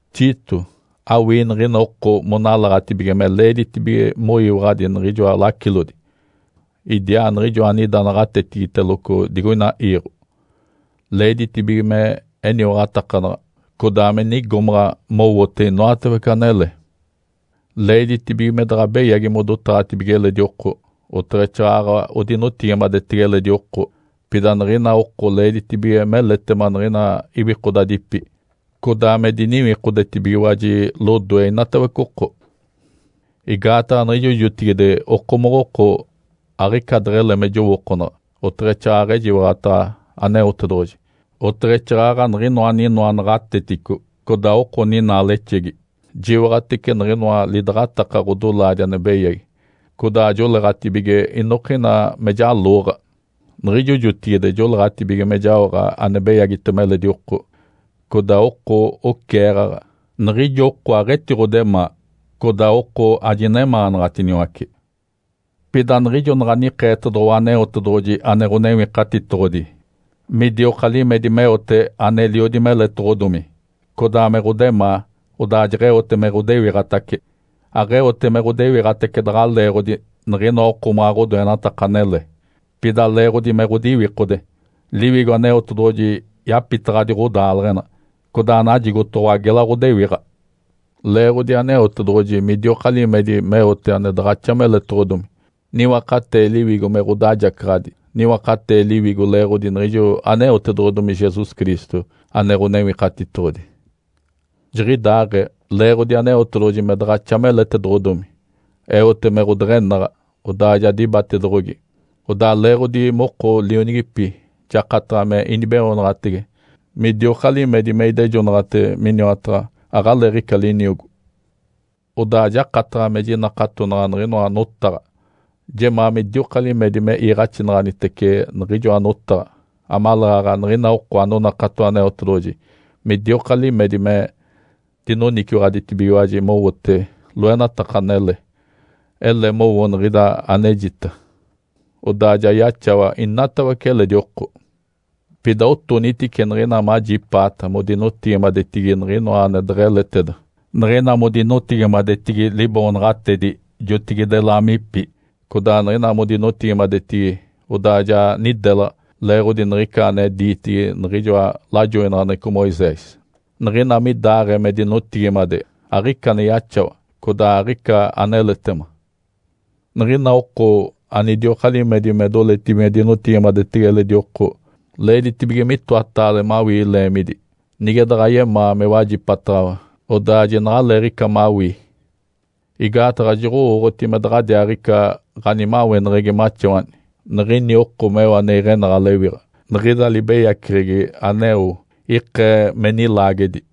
Tito, awii niɡ̶ina oko monalaɡ̶atibige me leeditibige moyiwaɡ̶adi niɡ̶inoa lacilodi idiaa niɡ̶ijo anida naɡ̶atetigiteloco digoina iiɡ̶o. Leeditibige me eniwaɡ̶atakanaɡ̶a, codaa me nigomaɡ̶a mowote inoatawece anele. Leeditibige me daɡ̶a beyagi modotaɡ̶atibige eledi oko, oteɡ̶exaaɡ̶aɡ̶a odinotigimadetege eledi oko. Pida niɡ̶ina oko leeditibige meletema niɡ̶ina iwikodadipi, codaa me diniwikodetibigiwaji lodoe inatawece oko. Igaataɡ̶a niɡ̶ijo jotigide okomoɡ̶oko aɡ̶ica deɡ̶ele me jowookonaɡ̶a, oteɡ̶exaaɡ̶aɡ̶a ejiwaɡ̶ataɡ̶a Aneotedoɡ̶oji, oteɡ̶exaaɡ̶aɡ̶a niɡ̶inoa aninoa naɡ̶atetico, codaa oko ninaalexegi. Jiwaɡ̶atece niɡ̶inoa lidaɡ̶ataka ɡ̶odolaadi ane beyagi, codaa joleeɡ̶atibige inokina me jalooɡ̶a. Niɡ̶ijo jotigide joleeɡ̶atibige me jaoɡ̶a ane beyagitema eledi oko, codaa oko oceeɡ̶aɡ̶a. Niɡ̶ijo oko aɡ̶etiɡ̶odemaa, codaa oko ajinemaanaɡ̶atiniwace. Pida niɡ̶ijo naɡ̶a nikeetedoɡ̶owa Aneotedoɡ̶oji ane Ǥonewikatitoɡ̶odi midioka limedi meote aneliodi meletoɡ̶odomi, codaa me ɡ̶odemaa, odaa jeɡ̶eote me ɡ̶odewiɡ̶atace. Aɡ̶eote me ɡ̶odewiɡ̶atace daɡ̶a leeɡ̶odi niɡ̶inoa okomaɡ̶a ɡ̶odoenataka anele, pida leeɡ̶odi me ɡ̶odiwikode. Liwigo Aneotedoɡ̶oji yapitaɡ̶adi ɡ̶odaaleɡ̶ena, codaa najigotoɡ̶owa gela ɡ̶odewiɡ̶a. Leeɡ̶odi Aneotedoɡ̶oji midioka limedi meote ane daɡ̶axa meletoɡ̶odomi, niwakatee Liwigo me ɡ̶odajacaɡ̶adi. Niwakatee Liwigo leeɡ̶odi niɡ̶ijo aneotedoɡ̶odomi Jesus Cristo ane Ǥonewikatitoɡ̶odi. Jiɡ̶idaaɡ̶ee, leeɡ̶odi Aneotedoɡ̶oji me daɡ̶axa meletedoɡ̶odomi, eote me ɡ̶odeɡ̶enaɡ̶a, odaa ja dibatedoɡ̶ogi. Odaa leeɡ̶odi moko lionigipi jakataɡ̶a me inibeoonaɡ̶atege midioka limedi me idejonaɡ̶ate miniwataɡ̶a aɡ̶aleeɡ̶ica liniogo. Odaa jakataɡ̶a me jinakatonaɡ̶a niɡ̶inoa notaɡ̶a. Jemaa midioka limedi me iiɡ̶axinaɡ̶anitece niɡ̶ijoa notaɡ̶a amaleeɡ̶aɡ̶a niɡ̶ina oko anonakato Aneotedoɡ̶oji midioka limedi me dinoniciwaɡ̶aditibigiwaji mowote loenataka anele. Ele mowo niɡ̶ida anejita, odaa ja yaxawa inatawece eledi oko. Pida otonitice niɡ̶ina majipaata modinotigimadetigi niɡ̶inoa ane deɡ̶eleteda, niɡ̶ina modinotigimadetigi liboonaɡ̶atedi jotigide laamipi, codaa niɡ̶ina modinotigimadetigi odaa ja nidelaɡ̶a leeɡ̶odi niɡ̶ica ane diitigi niɡ̶ijoa lajoinaɡ̶aneɡ̶eco Moisés. Niɡ̶ina midaɡ̶aee me dinotigimade, aɡ̶ica ane yaxawa, codaa aɡ̶ica aneletema. Niɡ̶ina oko anidioka limedi me doletibige me dinotigimadetege eledi oko, leeditibige mitoataale mawii leemidi. Nige daɡ̶a yemaa me wajipataɡ̶awa, odaa jinaɡ̶aleeɡ̶ica mawii. Igaataɡ̶a joɡ̶owooɡ̶oti me daɡ̶adiaaɡ̶ica ɡ̶animaweneɡ̶egi maxawani niɡ̶ini oko meo me iɡ̶enaɡ̶a lewiɡ̶a. Niɡ̶ida libeyaceɡ̶egi aneo ikee me nilaagedi.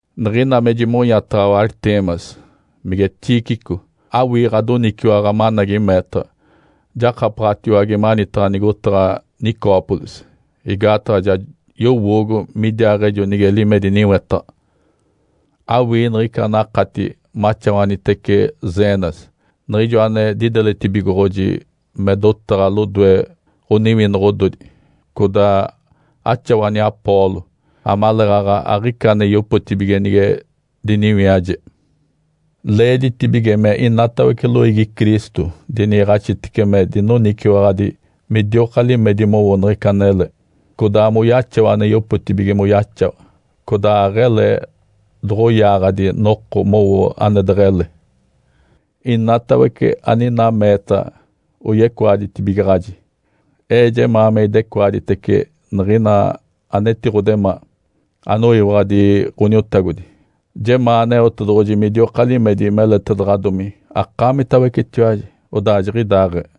Niɡ̶ina me jimonyataɡ̶awa Ártemas, mige Tíquico, awii ɡ̶adoniciwaɡ̶a managi meetaɡ̶a, jakapaɡ̶atiwage manitaɡ̶a nigotaɡ̶a Nicópolis, igaataɡ̶a ja yowoogo midiaaɡ̶ejo nige limedi niwetaɡ̶a. Awii niɡ̶ica anakati maxawanitece Zenas, niɡ̶ijo ane dideletibigoɡ̶oji me dotaɡ̶a lodoe ɡ̶oniwinoɡ̶odi, codaa axawani Apolo, amaleeɡ̶aɡ̶a aɡ̶ica ane yopotibige nige diniwiaje. Leeditibige me inatawece loiigi Cristo diniiɡ̶axitece me dinoniciwaɡ̶adi midioka limedi mowo niɡ̶ica anele, codaa moyaxawa ane yopotibige moyaxawa, codaa aɡ̶ele doɡ̶oyaaɡ̶adi noko mowo ane deɡ̶ele. Inatawece aninaa meetaɡ̶a oyecoaditibigaɡ̶aji. Ee jemaa me idecoaditece niɡ̶ina anetiɡ̶odemaa, anoyiwaɡ̶adi Ǥoniotagodi. Jemaa Aneotedoɡ̶oji midioka limedi meletedaɡ̶adomi akaamitawecetiwaji. Odaa jiɡ̶idaaɡ̶ee.